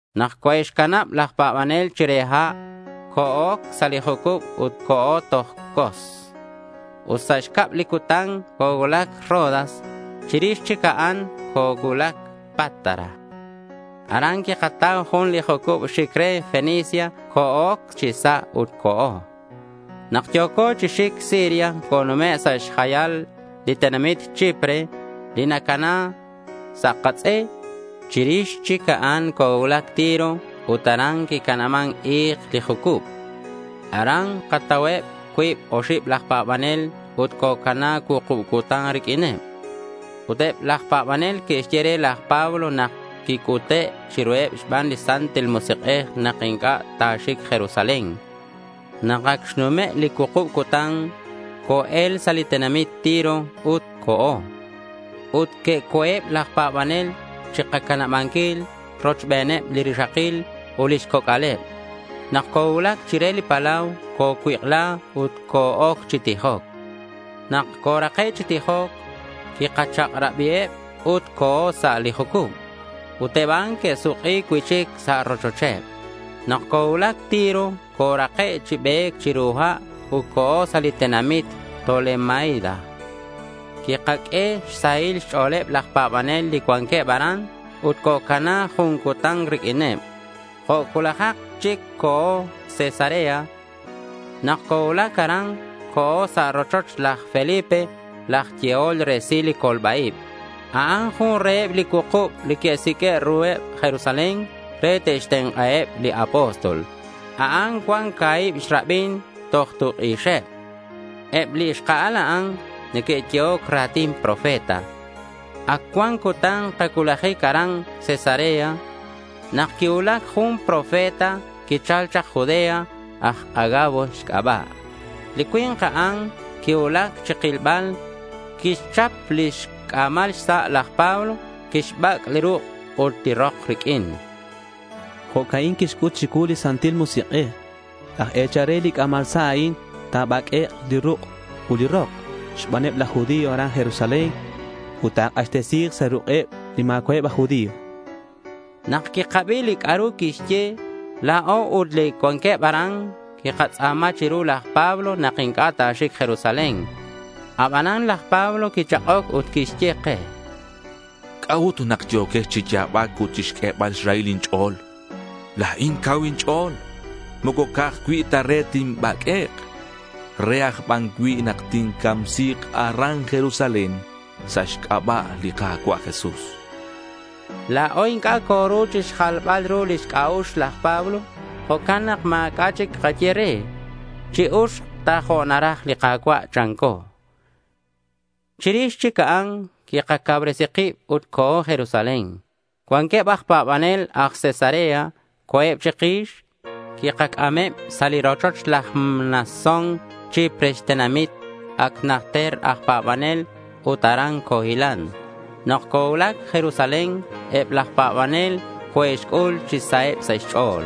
Nak coe'xcanab laj pa̱banel chire ha', co-oc sa' li jucub ut co̱o toj Cos. Ut sa' xcab li cutan cocuulac Rodas. Chirix chic a'an, cocuulac Pátara. Aran quikatau jun li jucub xic re Fenicia. Co-oc chi sa' ut co̱o. Nak yo̱co chi xic Siria conume' sa' xjayal li tenamit Chipre, li nacana sa' katz'e. Chirix chic a'an cocuulac Tiro ut aran quicanaban i̱k li jucub. Aran katauheb cuib oxib laj pa̱banel ut cocana cuukub cutan riq'uineb. Ut eb laj pa̱banel que'xye re laj Pablo nak quic'ute' chiruheb xban li Santil Musik'ej nak inc'a' ta̱xic Jerusalén. Nak ac xnume' li cuukub cutan, co-el sa' li tenamit Tiro ut co̱o. Ut que'co̱eb laj pa̱banel chikacanabanquil rochbeneb li rixakil ut lix coc'aleb. Nak cocuulac chire li palau, cocuik'la ut co-oc chi tijoc. Nak corake' chi tijoc, quikachak'rabiheb ut co̱o sa' li jucub. Ut eb a'an que'suk'i cui'chic sa' li rochocheb. Nak cocuulac Tiro corake' chi be̱c chiru ha' ut co̱o sa' li tenamit Tolemaida. Quikaq'ue xsahil xch'o̱leb laj pa̱banel li cuanqueb aran ut cocana jun cutan riq'uineb. Jo' cuulajak chic co̱o Cesarea. Nak cocuulac aran, co̱o sa' rochoch laj Felipe laj yehol resil li colba-ib. A'an jun reheb li cuukub li que'siq'ue' ruheb Jerusalén re te'xtenk'aheb li apóstol. A'an cuan ca̱hib xrabin toj tuk' ixeb. Eb li xka'al a'an neque'yehoc ra̱tin profeta. Ac cuan cutan kacuulajic aran Cesarea nak quicuulac jun profeta quichal chak Judea, aj Agabo xc'aba'. Li cui̱nk a'an quicuulac chikilbal. Quixchap lix c'a̱mal xsa' laj Pablo. Quixbac' li ruk' ut li rok riq'uin. —Jo'ca'in xc'ut chicuu li Santil Musik'ej, chan. —Laj e̱chal re li c'a̱mal sa' a'in ta̱baq'uek' li ruk' ut li rok xbaneb laj judío aran Jerusalén ut ta̱k'axtesi̱k sa' ruk'eb li ma̱cua'eb aj judío, chan. Nak quikabi li c'a'ru quixye, la̱o ut eb li cuanqueb aran quikatz'a̱ma chiru laj Pablo nak inc'a' ta̱xic Jerusalén. Abanan laj Pablo quichak'oc ut quixye ke: —¿C'a'ut nak yo̱quex chi ya̱bac ut chixq'uebal xrahil inch'o̱l? La̱in cau inch'o̱l, moco ca'aj cui' ta re tinbaq'uek'. Re aj ban cui' nak tincamsi̱k aran Jerusalén sa' xc'aba' li Ka̱cua' Jesús, chan. La̱o inc'a' coru chixjalbal ru lix c'a'ux laj Pablo. Jo'can nak ma̱c'a' chic kaye re. Chi-uxk ta jo' naraj li Ka̱cua', chanco. Chirix chic a'an quikacauresi kib ut co̱o Jerusalén. Cuanqueb aj pa̱banel aj Cesarea co̱eb chikix. Quikac'ameb sa' li rochoch laj Mnasón Chipre xtenamit. Ac najter aj pa̱banel. Ut aran cohilan. Nak cocuulac Jerusalén, eb laj pa̱banel coe'xc'ul chi saheb sa' xch'o̱l.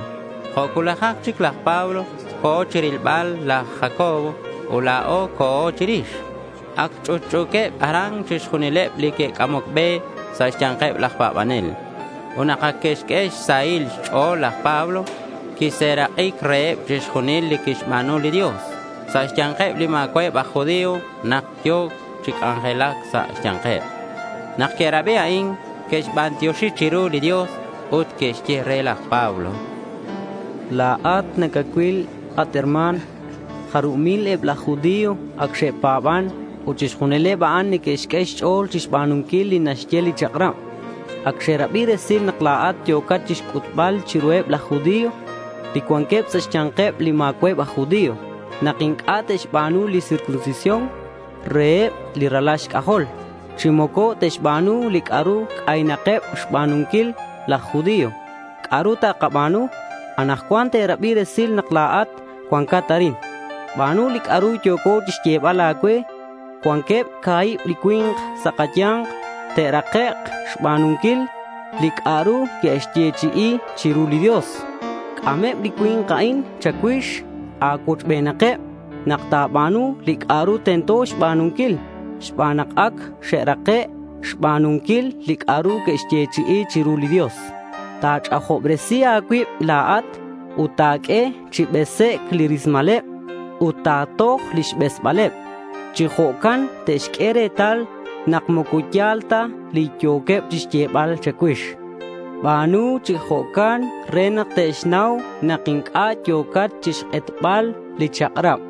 Jo' cuulajak chic laj Pablo co̱ chirilbal laj Jacobo ut la̱o co̱o chirix. Ac ch'utch'u̱queb aran chixjunileb li neque'c'amoc be sa' xya̱nkeb laj pa̱banel. Ut nak ac xq'ueheb xsahil xch'o̱l, laj Pablo quixserak'i reheb chixjunil li quixba̱nu li Dios sa' xya̱nkeb li ma̱cua'eb aj judío nak yo̱ chi c'anjelac sa' xya̱nkeb. Nak que'rabi a'in que'xbantioxi chiru li Dios. Ut que'xye re laj Pablo: —La̱at nacacuil, at herma̱n, jarub mil eb laj judío ac xe'pa̱ban. Ut chixjunileb a'an neque'xq'ue xch'o̱l chixba̱nunquil li naxye li chak'rab. Ac xe'rabi resil nak la̱at yo̱cat chixc'utbal chiruheb laj judío, li cuanqueb sa' xya̱nkeb li ma̱cua'eb aj judío, nak inc'a' te'xba̱nu li circuncisión reheb li ralal xc'ajol, chi moco te'xba̱nu li c'a'ru c'aynakeb xba̱nunquil laj judío. ¿C'a'ru takaba̱nu? Anakcuan te'rabi resil nak la̱at cuancat arin. Ba̱nu li c'a'ru yo̱co chixyebal a̱cue. Cuanqueb ca̱hib chi cui̱nk sa' kaya̱nk te'rakek' xba̱nunquil li c'a'ru que'xyechi'i chiru li Dios. C'ameb li cui̱nk a'in cha̱cuix. A̱cuochbenakeb nak ta̱ba̱nu li c'a'ru tento xba̱nunquil xban nak ac xe'rake' xba̱nunquil li c'a'ru que'xyechi'i chiru li Dios. Ta̱ch'ajobresi a̱cuib la̱at ut ta̱q'ue chi besec' li rismaleb ut ta̱toj lix besbaleb. Chi jo'can te'xq'ue retal nak moco ya̱l ta li yo̱queb chixyebal cha̱cuix. Ba̱nu chi jo'can re nak te'xnau nak inc'a' yo̱cat chixk'etbal li chak'rab.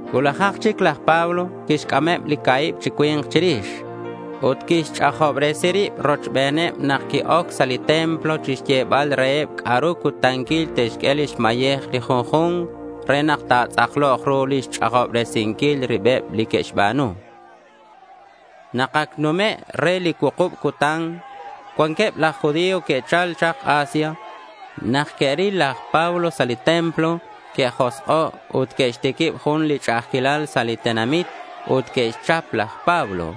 Cuulajak chic laj Pablo quixc'ameb li ca̱hib chi cui̱nk chirix. Ut quixch'ajobresi rib rochbeneb nak qui-oc sa' li templo chixyebal reheb c'a'ru cutanquil te'xq'ue lix mayej li junju̱nk re nak ta̱tz'aklok ru li xch'ajobresinquil ribeb li que'xba̱nu. Nak ac numec' re li cuukub cutan, cuanqueb laj judío que'chal chak Asia. Nak que'ril laj Pablo sa' li templo, que'josk'o' ut que'xtiquib jun li ch'a'ajquilal sa' li tenamit ut que'xchap laj Pablo.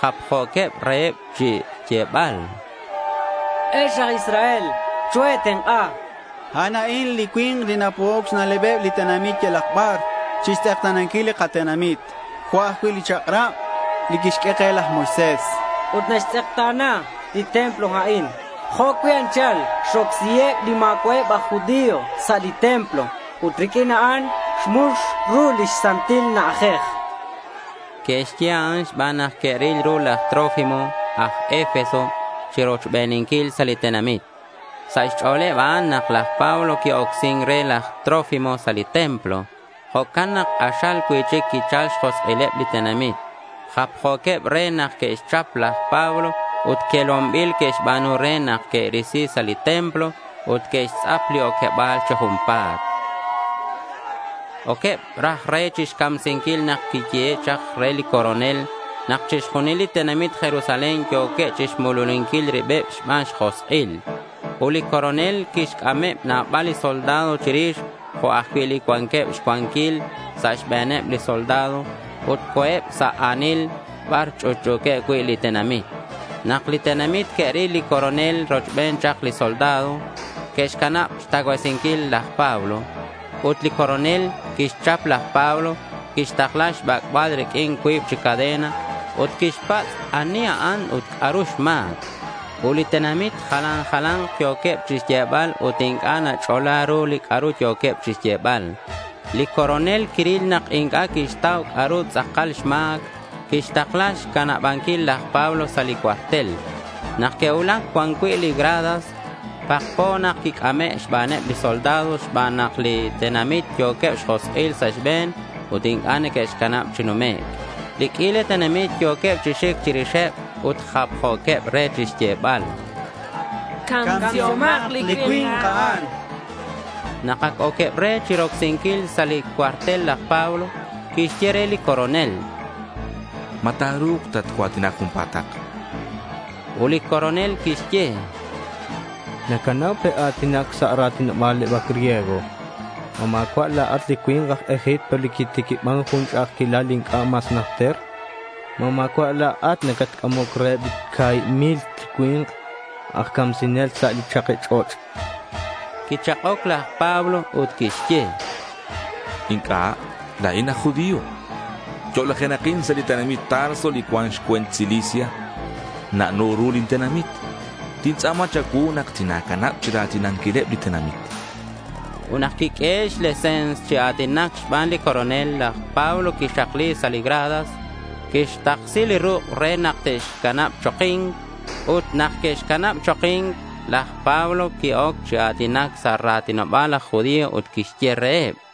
Japjo̱queb re chixyebal: —Ex aj Israel, choe̱tenk'a. A'an a'in li cui̱nk li napo'oc xna'lebeb li tenamit yalak bar chixtz'ekta̱nanquil li katenamit, jo' ajcui' li chak'rab li quixq'ue ke laj Moisés. Ut naxtz'ekta̱na li templo a'in. Jo' cui' anchal xrocsiheb li ma̱cua'eb aj judío sa' li templo ut riq'uin a'an, xmux ru li Santil Na'ajej, chanqueb. Que'xye a'an xban nak que'ril ru laj Trófimo aj Efeso chirochbeninquil sa' li tenamit. Sa' xch'o̱leb a'an nak laj Pablo qui-ocsin re laj Trófimo sa' li templo. Jo'can nak k'axal cui'chic quichal xjosk'ileb li tenamit. Japjo̱queb re nak que'xchap laj Pablo ut quelonbil que'xba̱nu re, nak que'risi sa' li templo. Ut que'xtz'ap li oqueba̱l chi junpa̱t. Oqueb raj re chixcamsinquil nak quiyehe' chak re li coronel nak chixjunil li tenamit Jerusalén yo̱queb chixmululinquil ribeb xbaneb xjosk'il. Ut li coronel quixc'ameb nabal li soldado chirix jo' ajcui' li cuanqueb xcuanquil sa' xbe̱neb li soldado, ut co̱eb sa' a̱nil bar ch'utch'u̱queb cui' li tenamit. Nak li tenamit que'ril li coronel rochbeneb chak li soldado, que'xcanab xtacuasinquil laj Pablo. Ut li coronel quixchap laj Pablo. Quixtakla xbac'bal riq'uin cuib chi cadena. Ut quixpatz' ani a'an ut c'a'ru xma̱c. Ut li tenamit jalan jala̱nk yo̱queb chixyebal ut inc'a' nach'ola ru li c'a'ru yo̱queb chixyebal. Li coronel quiril nak inc'a' quixtau c'a'ru tz'akal xma̱c. Quixtakla xcanabanquil laj Pablo sa' li cuartel. Nak que'cuulac cuan cui' li gradas, pakpo nak quic'ame' xbaneb li soldado xban nak li tenamit yo̱queb xjosk'il sa' xbe̱n ut inc'a' neque'xcanab chi numec'. Li q'uila tenamit yo̱queb chi xic chirixeb ut japjo̱queb re chixyebal: —¡Camsihomak li cui̱nk a'an! chanqueb. Nak ac oqueb re chirocsinquil sa' li cuartel laj Pablo, quixye re li coronel: —¿Ma ta̱ru̱k tatcua̱tina junpa̱tak?— Ut li coronel quixye: —Nacanau pe' a̱tinac sa' li a̱tinoba̱l griego. ¿Ma ma̱cua' la̱at li cui̱nk laj Egipto li quitiquiban jun ch'a'ajquilal inc'a' mas najter? ¿Ma ma̱cua' la̱at catc'amoc reheb li ca̱hib mil chi cui̱nk aj camsinel sa' li chaki ch'och'? chan. Quichak'oc laj Pablo ut quixye: —Inc'a'. La̱in aj judío. Yo'lajenakin sa' li tenamit Tarso li cuan xcue̱nt Cilicia. Na'no ru lin tenamit. Tintz'a̱ma cha̱cuu nak tina̱canab chira̱tinanquileb li tenamit, chan. Ut nak quiq'uehe' xlese̱ns chi a̱tinac xban li coronel, laj Pablo quixakli sa' li gradas. Quixtaksi li ruk' re nak te'xcanab choki̱nc. Ut nak que'xcanab choki̱nc, laj Pablo qui-oc chi a̱tinac sa' ra̱tinoba̱leb laj judío ut quixye reheb: